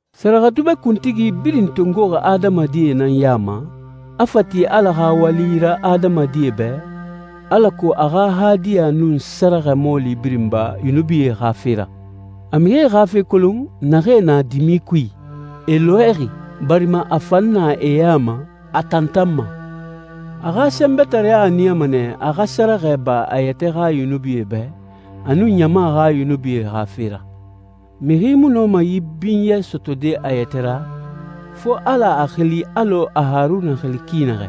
Sɛrɛxɛdubɛ kuntigi birin tongoxi adamadie nan ya ma, a fa ti Ala xa wali ra adamadie bɛ, alako a xa hadiya nun sɛrɛxɛ mɔɔli birin ba yunubie xa fe ra. A mixie xa fe kolon naxee na dimi kui, e lɔɛxi, barima a fan na e ya ma, a tantanma. A xa sɛnbɛtareya a niyama nɛ a xa sɛrɛxɛ ba a yɛtɛ xa yunubie bɛ, a nun ɲama xa yunubie xa fe ra. Mixi mu nɔma yi binyɛ sɔtɔde a yɛtɛ ra, fo Ala a xili alɔ a Haruna xili ki naxɛ.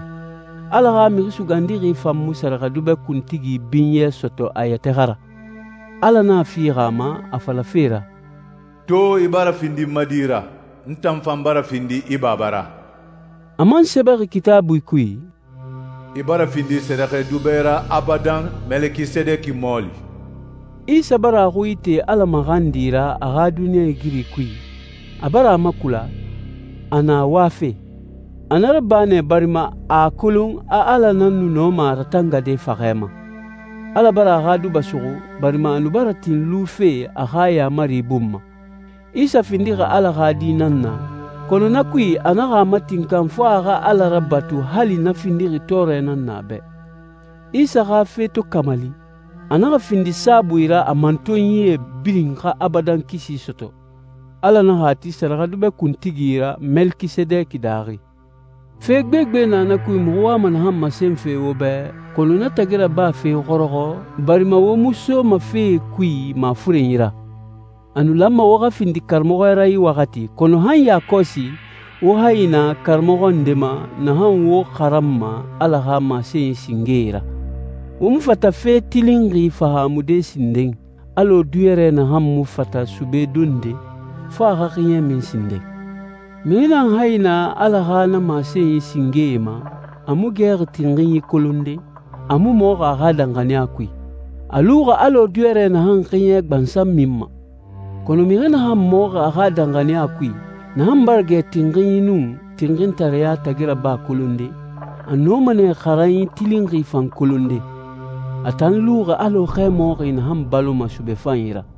Ala xa Mixi Sugandixi fan mu sɛrɛxɛdubɛ kuntigi binyɛ sɔtɔ a yɛtɛ xa ra. Ala nan a fixi a ma, a falafe ra, «To i bara findi n ma di ra. N tan fan bara findi i Baba ra.» A man sɛbɛxi Kitaabui kui, «I bara findi sɛrɛxɛdubɛ ra abadan, Melekisedeki mɔɔli.» Isa bara a xui ite Ala maxandi ra a xa duniɲɛigiri kui, a bara a makula, a na wafe. A na raba nɛ barima a a kolon a Ala nan nu nɔma a ratangade faxɛ ma. Ala bara a xa duba suxu, barima a nu bara tin lufe a xa yaamari bun ma. Isa findixi Ala xa Di nan na, kɔnɔ na kui a naxa a matinkan fo a xa Ala rabatu hali na findixi tɔɔrɛ nan na a bɛ. Isa xa fe to kamali, a naxa findi saabui ra a mantonyie birin xa abadan kisi sɔtɔ. Ala naxa a ti sɛrɛxɛdubɛ kuntigi ra Melekisedeki daaxi. Fe gbegbe na na kui muxu wama naxan masenfe wo bɛ, kɔnɔ na tagi rabafe xɔrɔxɔ, barima wo mu soma fee kui mafurenyi ra. A nu lanma wo xa findi karamɔxɔ ra yi waxati, kɔnɔ han yakɔsi wo hayi na karamɔxɔ nde ma naxan wo xaranma Ala xa masenyi singee ra. Wo mu fata fe tilinxi fahaamude sinden, alɔ diyɔrɛ naxan mu fata sube donde, fo a xa xiɲɛ min sinden. Mixi naxan hayi na Ala xa na masenyi singee ma, a mu gɛxi tinxinyi kolonde, a mu mɔxi a xa danxaniya kui. A luxi alɔ diyɔrɛ naxan xiɲɛ gbansan minma. Kɔnɔ mixi naxan mɔxi a xa danxaniya kui, naxan bara gɛ tinxinyi nun tinxintareya tagi raba kolonde, a nɔma nɛ xaranyi tilinxi fan kolonde. A tan luxi alɔ xɛmɔxi naxan baloma sube fanyi ra.